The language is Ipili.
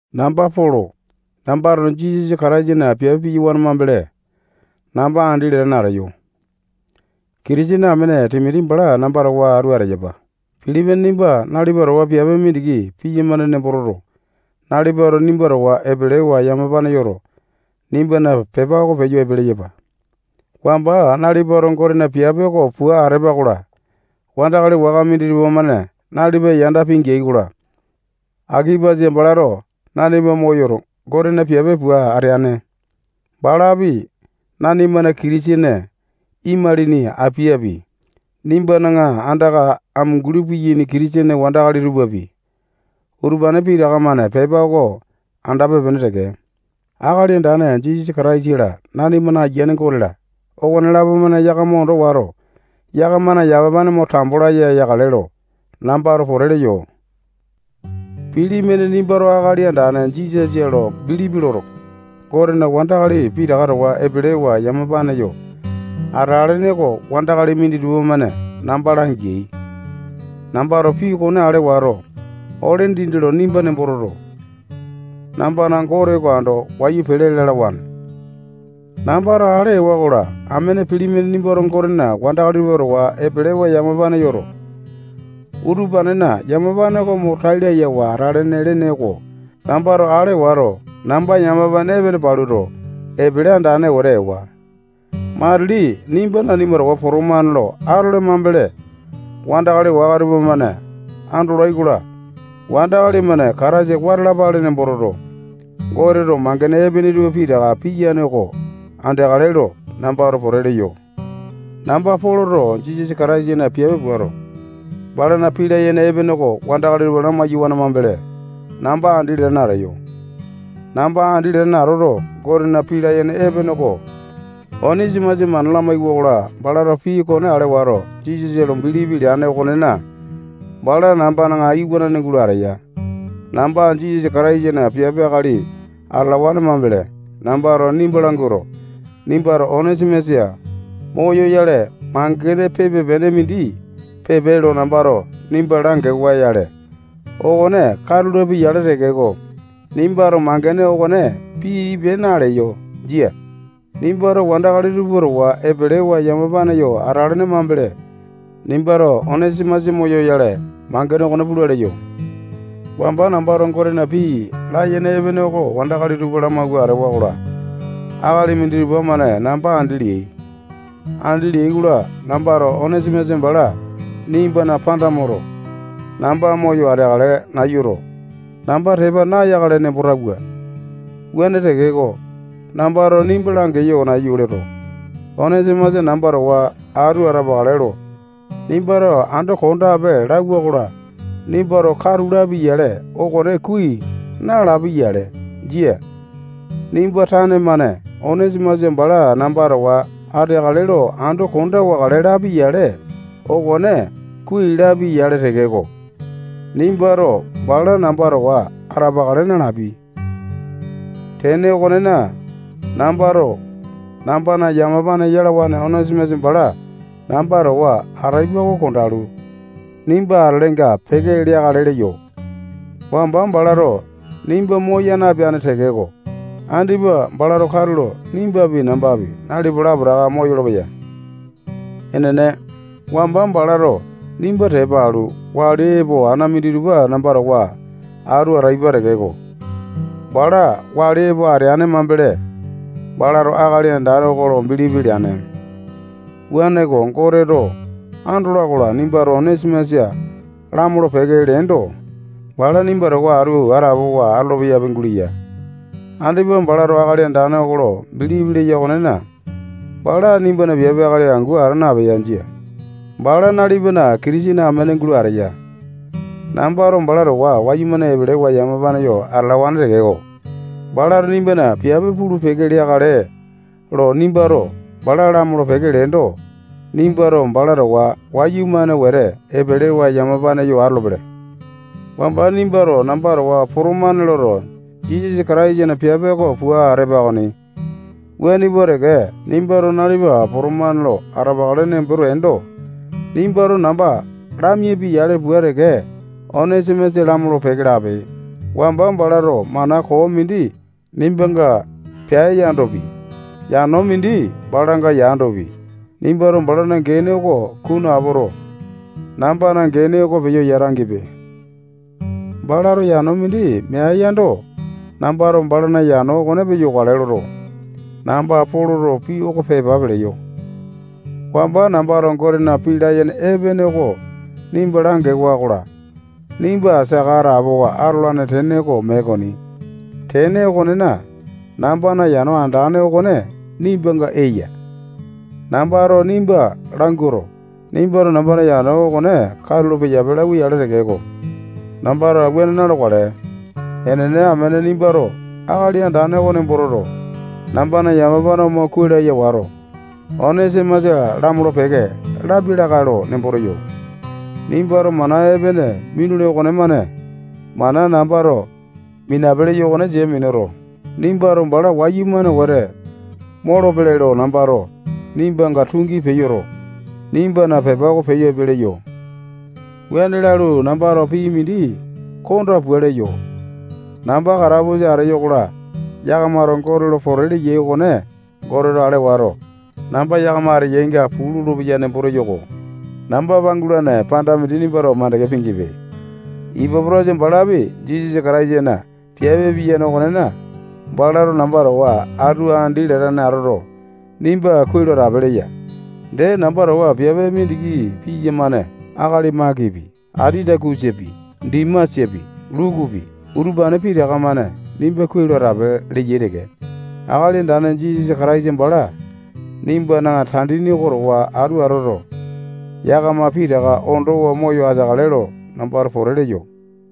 Namba Polo. Nambato Jisasa Kataisana piape piyawane mambele, namba andi latane ateyo. Kitisene amene Timoti bala namba towa atu ateyapa. Pilimone nimba nalipa towa piape mindiki piyamane nembo toto, nalipato nimba towa epelewa yamapa yoto, nimbana pepa oko peyo epe leyapa. Wamba nalipato Gotena piape oko pua atepa-kola, wandakali waka minditupa-mane nalipa yanda pingeai-kola, Akipasa balato nanima moyoto, Gotena piape pua ateane. Balapi, nanimana Kitisene imalini Apiapi, nimbana andaka amunguli piyaini Kitisene wandakali tupapi, utupane pitaka-mane pepa oko andape-pene teke. Akali Andane Jisasa Kataisa-la, nanimana Ayiane Gote-la, okonelapo-mane yakama ondo wato, yakamana yamapane mo tambo laya yakale lo nambato pote leyo. Pilimone nimbato Akali Andane Jisasa lo bilipi loto, Gotena wandakali pitaka towa epelewa yamapane yo atelene oko wandakali minditupa-mane namba langeai. Nambato pii okone ale wato, ole dindi lo nimba nembo toto, nambana Gote oko ando wayu pele lalawane. Nambato ale ewa-kola, amene Pilimone nimbato Gotena wandakali tupa towa epelewa yamapane yoto, utupanena yamapane oko mo tai layawa atalane lene okone nambato ale wato, namba yamapane epene paluto, epele andane wete ewa. Matili nimba nanima towa potomane lo atole mambele, wandakali waka tupamane andolai-kola, wandakali-mane Kataisa wata alapale nembo toto, Goteto mangene epene tupa pitaka piyane oko andeakale lo nambato pote leyo. Namba Poloto Jisasa Kataisana piape puato, balana pii layene epene oko wandakali tupa lamai-yawane mambele, namba andi latane ateyo. Namba andi latane atoto, Gotena pii layene epene oko Onesimasa mana lamaiwa-kola, balato pii okone ale wato, Jisasa lo bilipi leane okonena, bala nambana iwanane gulo ateya. Namba Jisasa Kataisana piape akali atalawane mambele, nambato nimba languato, nimbato Onesimasa moyoyale, mangene pipe-pene mindi pipe lo nambato nimba langiwa-yale, okone katu lapia-yale tekeko, nimbato mangene okone pipe naleyo. Jia. Nimbato wandakali tupa towa epelewa yamapane yo atalene mambele, nimbato Onesimasa moyoyale, mangene okone pula leyo. Wamba nambato Gotena pii layene epene oko wandakali tupa lamawua atewa-kola, akali minditupa-mane namba andi leai. Andi leai-kola, nambato Onesimasa bala nimbana panda moto, namba moyo ateakale nayuto, namba tepa nayakale nemboto atawua. Wuane tekeko, nambato nimba langeyo nayu loto, Onesimasa namba towa atu ateakale lo nimbato ando kondape lauwa-kola, nimbato katu lapi-yale, okone kuai nalapia-yale. Jia. Nimba tane-mane Onesimasa bala namba towa ateakale lo ando konda wakale lapi-yale, okone kuai lapia-yale tekeko, nimbato bala namba towa atalapa nalapi. Tene okonena, nambato nambana yamapane yalawane Onesimasa bala namba towa ataipa oko kondalu, nimba atelenga peke leakale leyo. Wamba balato nimba moya napeane tekeko, andipa balato katulo nimbapi, nambapi, nalipa lapotaka moyolo-peya. Enene, wamba balato nimba tepa alu, wali epoto, ana minditupa namba towa atu ataipa tekeko, bala wali epo ateane mambele, balato Akali Andane oko lo bilipi leane. Wuaneko, Goteto andola-kola, nimbato Onesimasa lamolo-peke leendo, bala nimba towa atu atapowa atolo-peyapi guleya. Andipa balato Akali Andane oko lo bilipi leya okonena, bala nimbana piape akali angu ata napeya. Jia. Bala nalipana Kitisene amene gulo ateya. Nambato bala towa wayumane epelewa yamapane yo atalawane tekeko, balato nimbana piape pulu-peke leakale lo nimbato bala lamolo-peke leendo, nimbato bala towa wayumane wete epelewa yamapane yo atolopele. Wamba nimbato namba towa potomane loto, Jisasa Kataisana piape oko pua atepa okoni. Wuane pua teke, nimbato nalipa potomane lo atapakale nembo teendo, nimbato namba lamiapi-yale pua teke, Onesimasa lamolo-peke lape. Wamba balato mana koo mindi nimbanga peae yandopi, yano mindi balanga yandopi, nimbato balana gene oko kunu apoto, nambana gene oko peyo yata-gipe. Balato yano mindi meae yando, nambato balana yano okone peyokale loto, namba Poloto pii oko pepa peleyo. Wamba nambato Gotena pii layene epene oko nimba langewa-kola, nimba saka atapowa atolane tene oko mee okoni. Tene okonena, nambana yano andane okone nimbanga eya. Nambato nimba languato, nimbato nambana yano okone peyape katulo lauwa-yale tekeko, nambato wuane na-lokale. Enene, amene nimbato Akali Andane oko nembo toto, nambana yamapane mo kuai laya wato, Onesimasa lamolo-peke lapi lakae lo nembo teyo. Nimbato mana epene minule okonemane mana nambato minape leyo okone sia minuto, nimbato bala wayumane wete moyolo-pele lo nambato nimbanga tungi peyoto, nimbana pepa oko peyo epe leyo. Wuane lalu, nambato pii mindi konda pua leyo. Namba katapusa ateyo-kola, yakamato Gote lo pote leyai okone Goteto ale wato, namba yakama ateyainga puu lolopeya nembo teyo-ko. Namba pangulane panda mindi nimbato mandeke pingepe. Ipapotasa balapi Jisasa Kataisana piape piyane okonena, balato namba towa atu andi latane atoto, nimba kuai lo atape leya. Dee, namba towa piape mindiki piyamane akali Makipi, Atitakusapi, Dimasapi, Lukupi, utupane pitaka-mane nimba kuai lo atape leyai teke. Akali Andane Jisasa Kataisa bala nimbana tandini oko towa atu atoto, yakama pitaka ondowa moyo ateakale lo nambato pote leyo.